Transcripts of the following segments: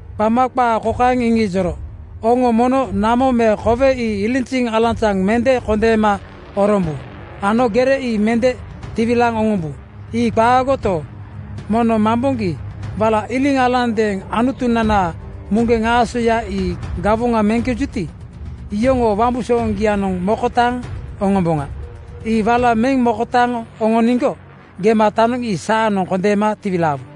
Qama qaa kokaeŋ iŋijoro, “Oŋo mono namo me kowe ii ilinziŋ alanzaŋ mende kondeema orombu ano gere ii mende tiwilaaŋ oŋombu. Ii qaagoto, mono mamboŋgi wala iliŋ alandeeŋ Anutunanaa muŋgeŋ aasoya ii gawoŋa meŋkejuti, iyoŋoo wambusooŋgianoŋ mokotaaŋ oŋomboŋa. Ii wala meŋ mokotaaŋ oŋoniŋgo gematanoŋ ii saanoŋ kondeema tiwilaawu.”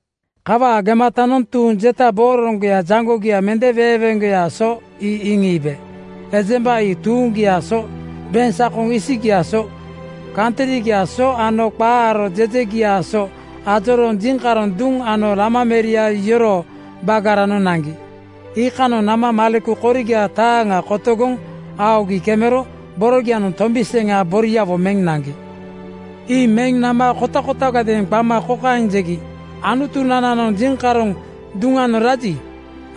Kawaa gematanoŋ tuuŋ jeta booroŋgoya jaŋgogia mende weeŋweeŋgoyaa so ii iŋiibe. Ejemba ii tuuŋgiaa so, beŋsakoŋ isigiaa so, kantrigiaa so ano qaa aro jejegiaa so ajorooŋ jiŋkaroŋ duŋ ano Lama meria yoroo bagaranoŋ naŋgi. Iikanoŋ nama maleku koriga taaŋa kotogoŋ aogi kemero borogianoŋ tombi seŋa boriawo meŋ naŋgi. Ii meŋ nama kotakotagadeeŋ qama kokaeŋ jegi, “Anutunananoŋ jiŋkaroŋ duŋanoŋ raji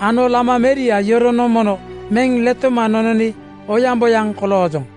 ano Lama meria yoronoŋ mono meŋ letoma nononi oyaŋboyaŋ koloojoŋ.”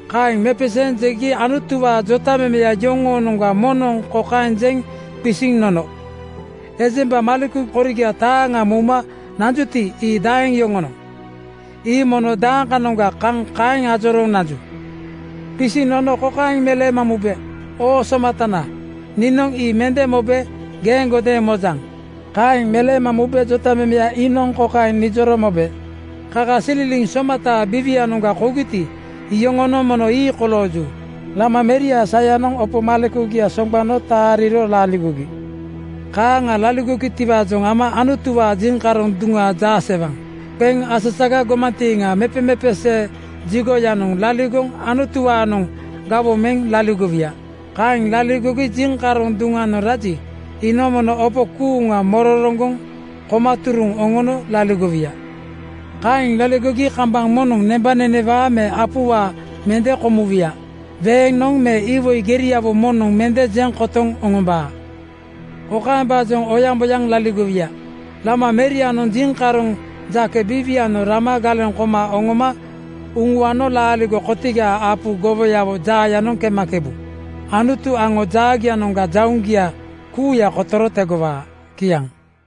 Kaeŋ mepeseeŋ jegi Anutuwaa jotamemeya yoŋoonoŋga moŋnoŋ kokaeŋ jeŋ qisiŋ nono, “Ejemba maleku koriga taaŋa mouma nanjuti, ii daaŋ yoŋonoŋ? Ii mono dakanoŋga kaŋ kaeŋ ajorooŋ nanju?” Qisiŋ nono kokaeŋ meleema mube, “Oo somatana, niinoŋ ii mende mobe geeŋgodeeŋ mojaŋ.” Kaeŋ meleema mube jotamemeya iinoŋ kokaeŋ nijoro mobe, “Kakasililiŋ somataa biiwianoŋga kougiti, iyoŋonoŋ mono ii kolooju. Lama meriaa sayanoŋ opo malekugia soŋgbano taaliro laligogi. Kaaŋa laligogitiwaajoŋ ama Anutuwaa jiŋkaroŋ duŋa jaasewaŋ qeŋ asaga gomantiiŋa mepemepesee jigoyanoŋ (tempel) laligoŋ Anutuwaanoŋ gawoŋ meŋ laligowuya. Kaeŋ laligogi jiŋkaroŋ duŋanoŋ raji, iinoŋ mono opo kuuŋa mororoŋgoŋ koma turuŋ oŋono laligowuya. “Kaeŋ laligogi kambaŋ moŋnoŋ nembanenewaa me apuwaa mende komuwuya. Weeŋnoŋ me iwoi geriawo moŋnoŋ mende jeŋ kotoŋ oŋombaa. Kokaembaajoŋ oyaŋboyaŋ laligowuya: Lama merianoŋ jiŋkaroŋ jake biiwianoŋ rama galeŋ koma oŋoma uŋuano laaligo kotigaa apu gowoyaa jaayanoŋ kemakebu. Anutu aŋo jaagianoŋga jauŋgia kuuya kotoro tegowaa.” Kiaŋ.